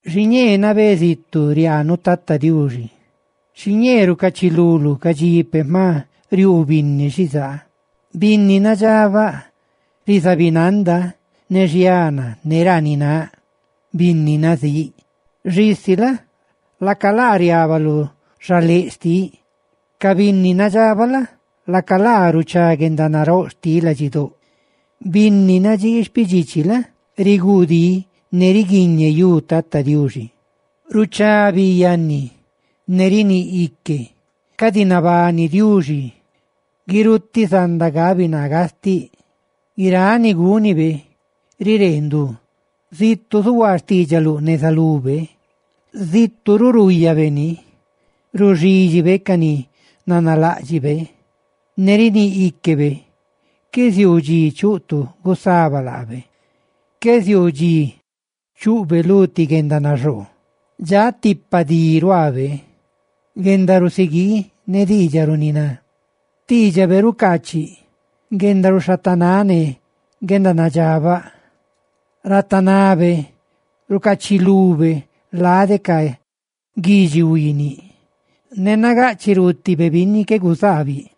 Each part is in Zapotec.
Xiñee nabé zitu riaanuꞌ, Tata Diuxi, xiñee rucachiluluꞌ ca dxi peꞌ jma riuu binni xizaa. Binni nadxabaꞌ rizabinanda ne xiana ne ranináꞌ binni nazíꞌ; xisi la? laca laa riaba lu xaléꞌ xtiꞌ. Ca binni nadxabaꞌ la? laca laa ruchá guendanaróꞌ xtiꞌ ladxidóꞌ; binni nadxii xpidxichi la? riguudí ne riguiñeyú Tata Diuxi. Ruchá bi yanni ne riníꞌ ique: «Cadi nabani Diuxi. Guirutiꞌ zanda gabi naa gastiꞌ.» Guiráꞌ ni gúnibe riree ndu. Zitu ruꞌ zuhuaa xtiidxaluꞌ neza lube, zitu ruꞌ ruuyabe ni. Ruxidxibe ca ni nanaláꞌdxibe, ne riníꞌ íquebe, qué ziuu dxi chuꞌ tu gusaba laabe, qué ziuu dxi chuꞌbe lu ti guendanaxoo. Dxaꞌ tipa di ruaabe, guendarusiguii ne diidxaꞌ runiná; xtiidxabe rucaachiꞌ guendaruxhatanáꞌ ne guendanadxabaꞌ. Ratanabe rucaachilube lade ca guidxi huiiniꞌ, ne nagaꞌchiꞌ ruutibe binni qué guzaabiꞌ.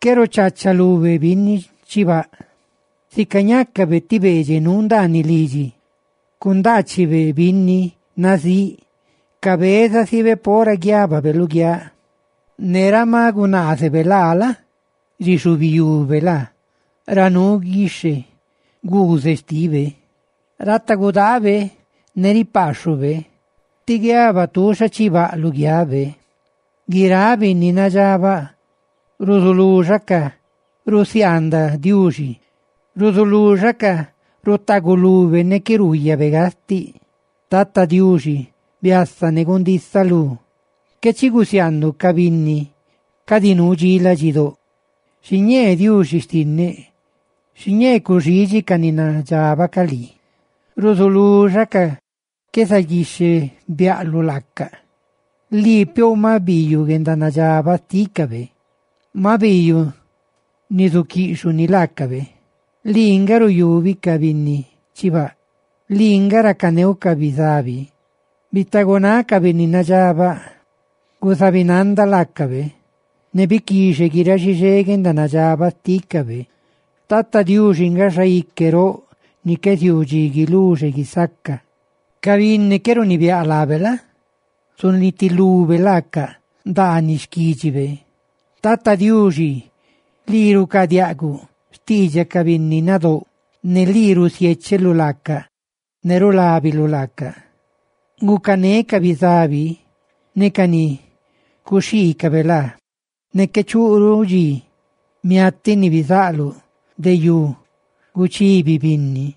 Qué ruchachalube binni chibaꞌ, sica ñácabe ti beedxeꞌ nuu ndaaniꞌ lidxi, cundaachibe binni nazíꞌ, cabezasibe pora guiababe luguiáꞌ, ne ra ma gunaazebe laa la? rixubiyube laa ra nuu guixhe guuzeꞌ xtibe. Ratagudaabe ne ripaaxhube, tí guiaba tuuxa chibaꞌ lu xhugabe. Guiráꞌ binni nadxabaꞌ ruzuluxacaꞌ rusiaandaꞌ Diuxi, ruzuluxacaꞌ rutagulube ne qué ruuyabe gastiꞌ. ¡Tata Diuxi, biasa ne gundisanaluꞌ! ¡Qué chi gusiaanduꞌ ca binni cadi nuu dxi ladxidóꞌ! Xiñee Diuxi xtinneꞌ, xiñee cuxiidxi ca ni nadxabaꞌ ca lii, ruzuluxacaꞌ qué zaguixhebiaꞌluꞌ laacaꞌ. Lii piouꞌ maꞌ biiyuꞌ guendanadxabaꞌ xtícabe; ¡maꞌ biiyuꞌ ni, zuquiꞌxhuꞌ ni laacabe! Lii nga ruyubi ca binni chibaꞌ; lii nga racaneuꞌ ca bizabi. ¡Bitagunáꞌ ca binni nadxabaꞌ! ¡Guzabinanda laacabe, ne biquixe guiráꞌ xixé guendanadxabaꞌ xtícabe! Tata Diuxi nga Xaique roꞌ ni qué ziuu dxi guiluxe guisaca; ¡ca binni qué runibiáꞌ laabe la? zunitilube laaca ndaaniꞌ xquídxibe! Tata Diuxi, lii rucaadiaꞌguꞌ xtiidxaꞌ ca binni nadóꞌ ne lii rusiécheluꞌ laacaꞌ ne rulábiluꞌ laacaꞌ. Gucané ca bizabi ne ca ni cuxhiicabe laa, ¡ne qué chuꞌruꞌ dxi, miatiꞌ ni bizaꞌluꞌ de yú, guchibi binni!